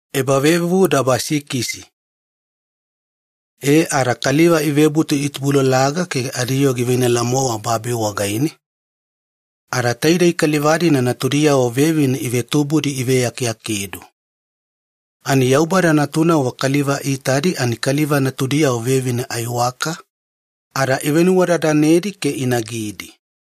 Kaliva ikoyona ifuifufudi. E ada kaliva ivebutu itubulalaga ke adiyoo giveinala-mowa babi wagaine, ada taidei kaliva-dina natudiyavo vevine ivetubudi iveakeakedu. Ani Yaubada natunavo kaliva iitadi ani kaliva natudiyavo vevine aiwaka ada ivenuwadadanedi ke inagidi.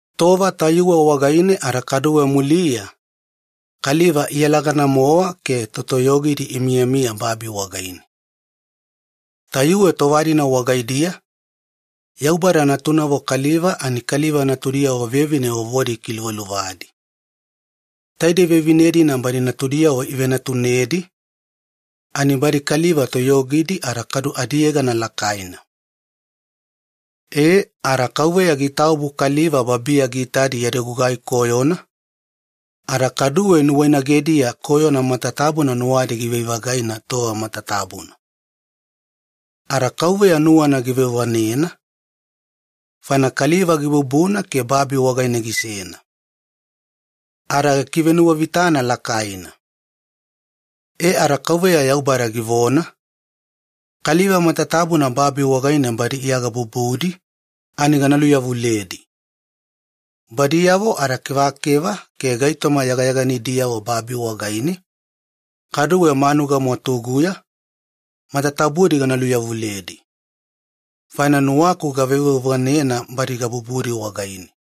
Tova tayuwe wagaine ada kaduwe muliya kaliva iyalagana-mowa ke totoyogidi imiyamiya babi wagaine. Tayuwe tova-dina wagaidiya Yaubada natunavo kaliva ani kaliva natudiyavo vevine vovodi ikiluvaluvadi. Taidei vevine-dina badi natudiyavo ivenatunedi, ani badi kaliva toyogidi ada kadu adiyegana lakaina. E, ada Yaubada giitaobu kaliva babiya giitadi yadi gugai koyona, ada kaduwe nuwainagediya koyona matatabuna nuwadi givai-vagaina tova matatabuna. Ada Yaubada nuwana giveuvanena faina kaliva gibubuna ke babi wagaine gisena. Tayuwe faine aseasena giulolo. E ada Yaubada givona, “Kaliva matatabuna babi wagaine badi iya gabubudi ani gana luveyawaliyedi. Ada kevakeva matatabu-moedi ke gaitoma seyana seyana yagayaganidiyavo babi wagaine gana luveyawaliyedi. Kaduwe manuga mwatuguya gana luveyawaliyedi. Faina nuwaku gaveuveuvanena badi gabubudi wagaine.”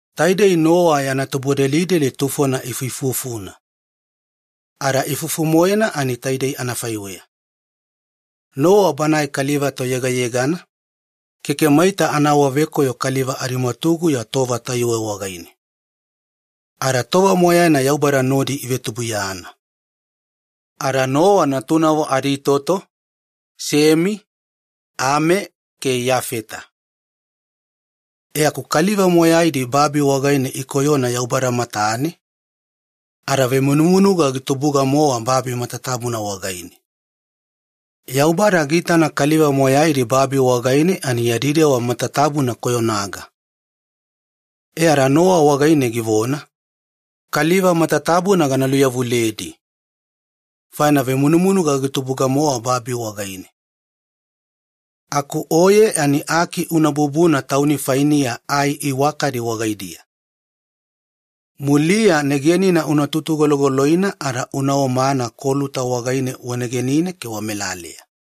Taidei Nowa ifuifufuna. Ada ifufu-moena ani taidei anafaiweya. Nowa banae kaliva toyegayegana, keke maita anaawavekoyo kaliva adimwatuguya tova tayuwe wagaine. Ada tova moyaina Yaubada nodi ivetubuiyana. Ada Nowa natunavo aditoto Semi, Ami ke Iyafeta. E aku kaliva moyaidi babi wagaine ikoyona Yaubada matane, ada veimunumunuga gitubuga-mowa babi matatabuna wagaine. Yaubada giitana kaliva matatabudi babi wagaine yadi dewa matatabuna koyonaga. E ada Nowa wagaine givona, “Kaliva matatabuna gana luveyawaliyedi, faina veimunumunuga gitubuga-mowa babi wagaine. Aku oye ani aki una bubuna tauni fainiya ai iwakadi wagaidiya. Muliya negenina una tutugologoloina ada una omana koluta wagaine wanegenine ke wamelaleya.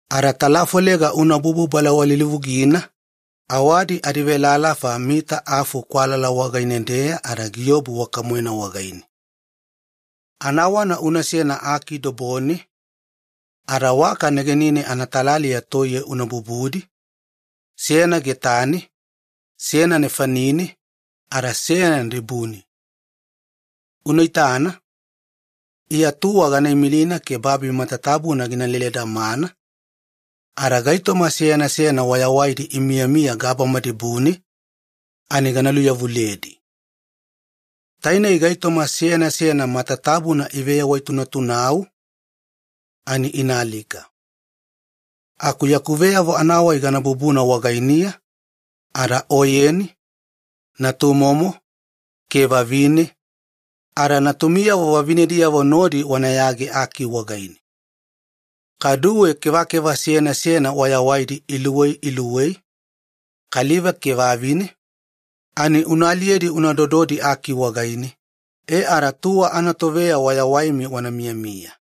Ada talafolega unabubu balawalilivugina, awadi adivelalafa afu mita kwalala wagaine-deya ada giobu waka-moena wagaine. Anawana unasena aki dobone ke waka negenine anatalaliya toiye una bubudi, seyana getane, seyana nefanine, ada seyana dibune. Unaitana, Iya tuwa gana imilina ke babi matatabuna gina leledamana, ada gaitoma seyana seyana wayawaidi imiyamiya gabama dibune ani gana luveyawaliyedi. Tainei gaitoma seyana seyana matatabuna iveyawaitunatunau ani inaalika. Aku veyavo anavonadabadaba gana bubuna wagainiya, ada oyeni, natumomo ke vavine ada natumiyavo vavinediyavo ke oye nodi wanayage aki wagaine. Kaduwe kevakeva seyana seyana wayawaidi iluwei iluwei, kaliva ke vavine una aliyedi una dododi aki wagaine wayawaimi wana miyamiya tuwa anatoveya.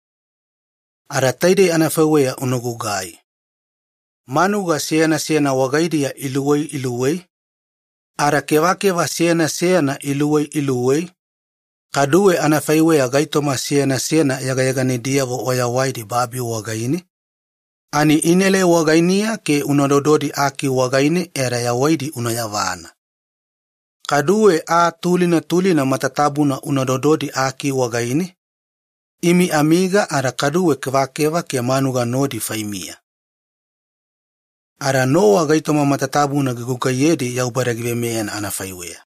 Ada taidei anafaiweya unagugai. Manuga seyana seyana wagaidiya iluwei iluwei, ada kevakeva seyana seyana iluwei iluwei, kaduwe anafaiweya gaitoma seyana seyana yagayaganidiyavo wayawaidi babi wagaine ani inaelai wagainiya ke una dododi aki wagaine ada yawaidi una yavana. Kaduwe aa tulina tulina matatabuna una dododi aki wagaine, imi amiga ada kaduwe kevakeva ke manuga nodi faimiya.” Ada Nowa gaitoma matatabuna gigugaiyedi Yaubada giveimeya anafaiweya.